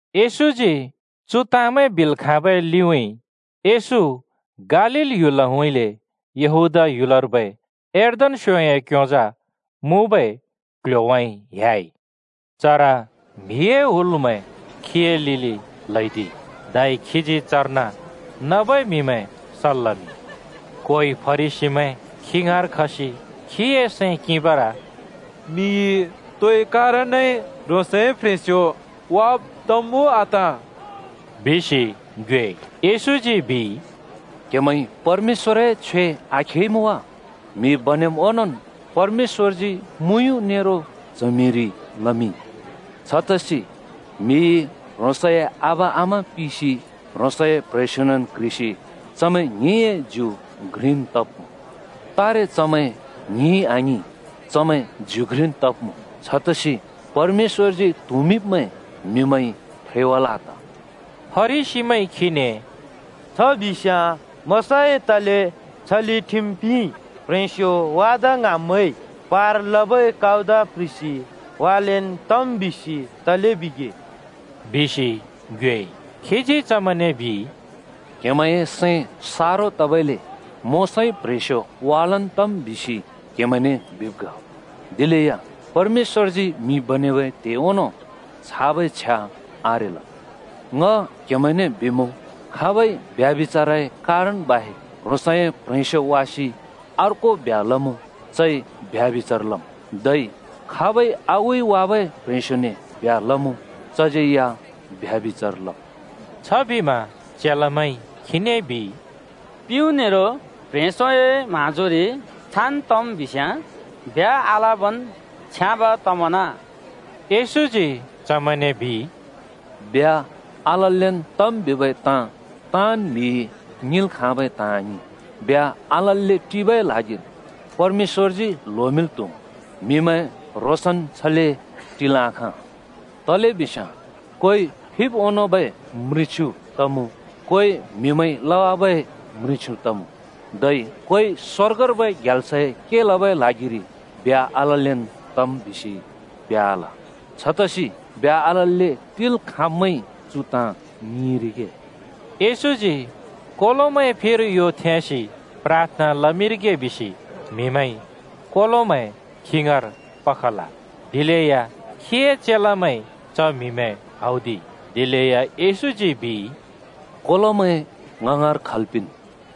येशूजी चु ताँमैं बिल् खाँबै लिउँइँ येशू गालील ह्‍युलउँइँले यहूदीया ह्‍‍‍युलर्बै यर्दन स्‍योंए क्योंजा मुँबै क्ल्ह्‍योउँइँ ह्‍याइ। चर म्‍हिए हुलमैं खीए लिलि ल्हैदिइ। धै खीजी चर्न नबै म्हिमैं सल् लमिंइ। कोइ फरिसीमैं खी ङाँर खसि खीए सैं किंबर “म्‍हिइ तो मुँले कारणइ ह्रोंसए प्ह्रेंस्यो वाब तम् उ आत?” बिसि ङ्योएइ। येशूजी बिइ, “क्‍हेमैंइ परमेश्‍वए छ्वे आखेइमुँ वा? म्‍हि बनेब् ओंनोंन् परमेश्‍वरजी मुँयुँ नेरो च्हमिरि लमिंइ। छतसि ‘म्हिइ ह्रोंसए आबा आमा पिसि ह्रोंसए प्‍ह्रेंस्‍योनेन् क्ह्रिसि चमैं ङ्हिंए ज्यु घ्रिन् तब्‍मुँ।’ तारे चमैं ङ्हिं आङिं, चमैं ज्यु घ्रिन् तब्मुँ। छतसि परमेश्‍वरजी त्हुँमिंब्मैं म्‍हिमैंइ फ्रेवाल् आत।” फरिसीमैंइ खीने “छ बिस्‍याँ मोशाइ तले छले ठिम पिंइ ‘प्ह्रेंस्यो वादा ङ्हाँब्‍मैंइ पार लबै कउदा प्‍ह्रिसि वालेन् तम्’ बिसि तले बिगे?” बिसि ङ्योएइ। खीजी चमैंने बिइ, “क्‍हेमैंए सैं सारो तबइले मोशाइ प्ह्रेंस्यो वालेन् तम् बिसि क्हेमैंने बिब् ग। दिलेया परमेश्‍वरजी म्‍हि बनेबै त्हे ओंनों छाबै छ्या आरेल। ङ क्हेमैने बिमुँ, खाबइ ब्यभिचारए कारण बाहेक् ह्रोंसए प्‍ह्रेंस्‍यो वासि अर्को ब्ह्‍या लमुँ, चइ ब्यभिचार लमुँ। धै खाबइ आगुइ वाबै प्ह्रेंस्योने ब्ह्‍या लमुँ चज्यै या ब्यभिचार लमुँ।” छबिमा चेलामैंइ खीने बिइ, “प्युँ नेरो प्ह्रेंस्योए म्हाँजोरि छान् तम् बिस्याँ ब्ह्‍या आलबन् छ्याँब तमना।” येशूजी चमैंने बिइ, “ब्ह्‍या आललेन् तम् बिबै ताँ ताँन् म्‍हिइ ङिंल् खाँबै ताँ आङिं। ब्ह्‍या आलल्‍ले टिबै ल्हागिर परमेश्‍वरजी ल्होमिंल् त्हुम्, म्‍हिमैं ह्रोंसन् छले टिल् आखाँ। तलेबिस्याँ कोइ फिब् ओनोंबै हिचड तमुँ, कोइ म्हिमैंइ लबै हिचड तमुँ। धै कोइ ‘स्‍वर्गर्बै ग्याल्सए के लबै ल्हागिरि ब्ह्‍या आललेन् तम्’ बिसि ब्ह्‍या आल। छतसि ब्ह्‍या आलल्‍ले टिल् खाँब्‍मैंइ चु ताँ ङिंरिगे।” येशूजी कोलोमैं फिर यो थेंसि प्राथना लमिंरिगे बिसि म्हिमैंइ कोलोमैं खी ङाँर पखल। दिलेया खीए चेलामैंइ च म्‍हिमैं हौदिइ। दिलेया येशूजी बिइ, “कोलोमैं ङ ङाँर खल् पिंन्,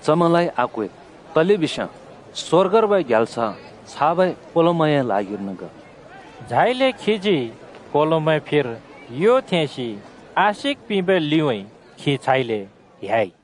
चमैं आक्वेद्। तलेबिस्याँ स्‍वर्गर्बै ग्याल्स छाबै कोलोमैंए ल्हागिर्न ग।” झाइले खीजी कोलोमैं फिर यो थेंसि आशिक पिंबै लिउँइँ खी छाइले ह्‍याइ।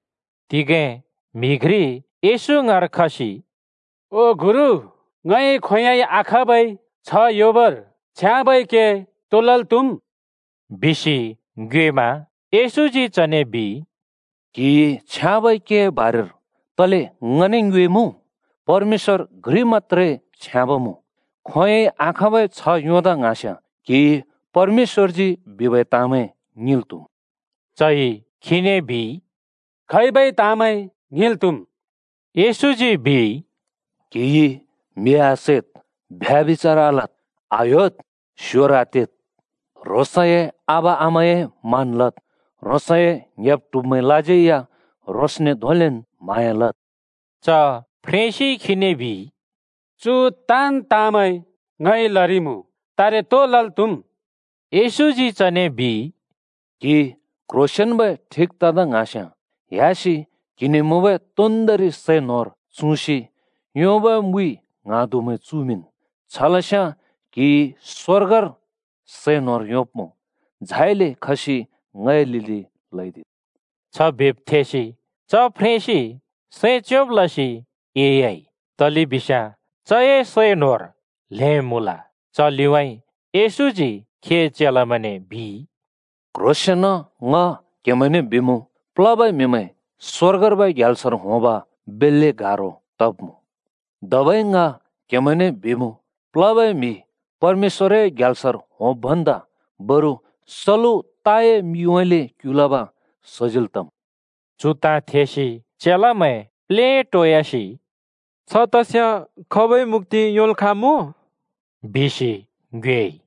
तिगें म्‍हि घ्रि येशू ङाँर खसि “ओ गुरु, ङइ खोंयोंइ आखाँबै छ्ह योंबर छ्याँबै के तो लल् त्हुमुँ?” बिसि ङ्योएमा येशूजी चने बिइ, “क्‍हिइ छ्याँबै केए बारेर तले ङने ङ्योएमुँ? परमेश्‍वर घ्रि मत्‍त्रे छ्याँब मुँ। खोंयोंइ आखाँबै छ्ह योंदा ङ्हाँस्‍याँ क्हिइ परमेश्‍वरजी बिबै ताँमैं ङिंल् त्‍हुम्।” चइ खीने बिइ, “खैबै ताँमैं ङिल् त्हुम्?” येशूजी बिइ, “क्हिइ म्‍हि आसैद्, ब्यभिचार आलद्, आह्‍योद्, स्‍योर आतेद्। ह्रोंसए आबा आमाए मान लद्। ह्रोंसए ङ्‍हेब्-ट्हुब्मैंलाज्यै या ह्रोंसने धोंलेन् म्हाँया लद्।” च फ्रेंसिइ खीने बिइ, “चु ताँन् ताँमैं ङइ लरिइमुँ। तारे तो लल् त्‍हुम्?” येशूजी चने बिइ, “क्‍हि क्‍ह्रोंसेंनन्बै ठिक तदा ङ्हाँस्‍याँ ह्‍यासि क्‍हिने मुँबै तोन्दोंरि सै न्होर चुँसि योंबै मुइ ङ्हाँदुमैं चुमिंन्। छलस्याँ क्‍हिइ स्‍वर्गर सै न्होर योंब्‍मुँ। झाइले खसि ङए लिलि ल्‍हैदिद्।” छ बिब् थेसि च फ्रेंसिं सैं च्योंब् लसि एह्‍याइ, तलेबिस्याँ चए सै न्होर ल्हें मुँल। च लिउँइँ येशूजी खीए चेलामैंने बिइ, “क्ह्रोंसेंन ङ क्हेमैंने बिमुँ, प्लबै म्‍हिमैं स्‍वर्गर्बै ग्याल्सर होंब बेल्‍ले गारो तब्मुँ। धबै ङ क्‍हेमैंने बिमुँ, प्लबै म्‍हि परमेश्‍वरए ग्याल्सर होंब् भन्दा बरु सलु ताए मिउँइँले क्‍युलब सजिल् तम्।” चु ताँ थेसि चेलामैं प्लेटोयासि “छ तस्‍याँ खाबइ मुक्‍ति योंल् खाँमुँ?” बिसि ङ्योएइ।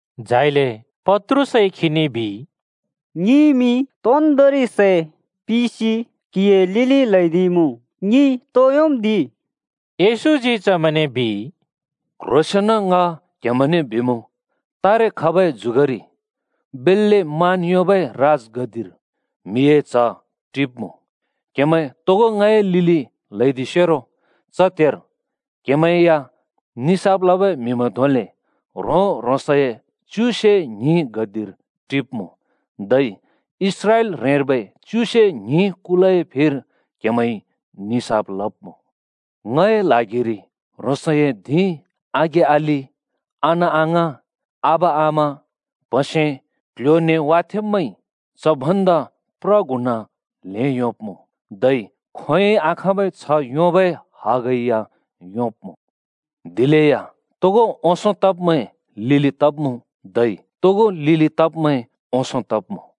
झाइले पत्रुसइ खीने बिइ, “ङिइमि तोन्दोंरि सै पिसि क्‍हिए लिलि ल्‍हैदिइमुँ। ङिइ तो योंम् दि?” येशूजी चमैंने बिइ, “क्ह्रोंसेंन ङ क्हेमैंने बिमुँ, तारे खबै जुगरि बेल्‍ले मान योंबै राजगद्दिर म्हिए च्ह टिब्‍मुँ। क्‍हेमैं तोगो ङए लिलि ल्‍हैदिसेरो च त्हेर क्‍हेमैं या निसाफ लबै म्‍हिमैं धोंले ह्रों-ह्रोंसए च्युसे ङ्हिं गद्दिर टिब्‍मुँ। धै इस्राएल ह्रेंर्बै च्युसे ङ्हिं कुलए फिर क्‍हेमैंइ निसाफ लब्‍मुँ। ङए ल्हागिरि ह्रोंसए धिं, आघें-अलि, अना-अङाँ, आबा-आमा, प्‍हसे, क्‍ल्‍ह्‍यो-न्‍हें वाथेंब्मैंइ च भन्दा प्र गुणा ल्हें योंब्‍मुँ। धै खोंयोंइ आखाँबै छ्ह योंबै हग या योंब्मुँ। दिलेया तोगो ओंसों तब्मैं लिलि तब्मुँ, धै तोगो लिलि तब्मैं ओंसों तब्‍मुँ।”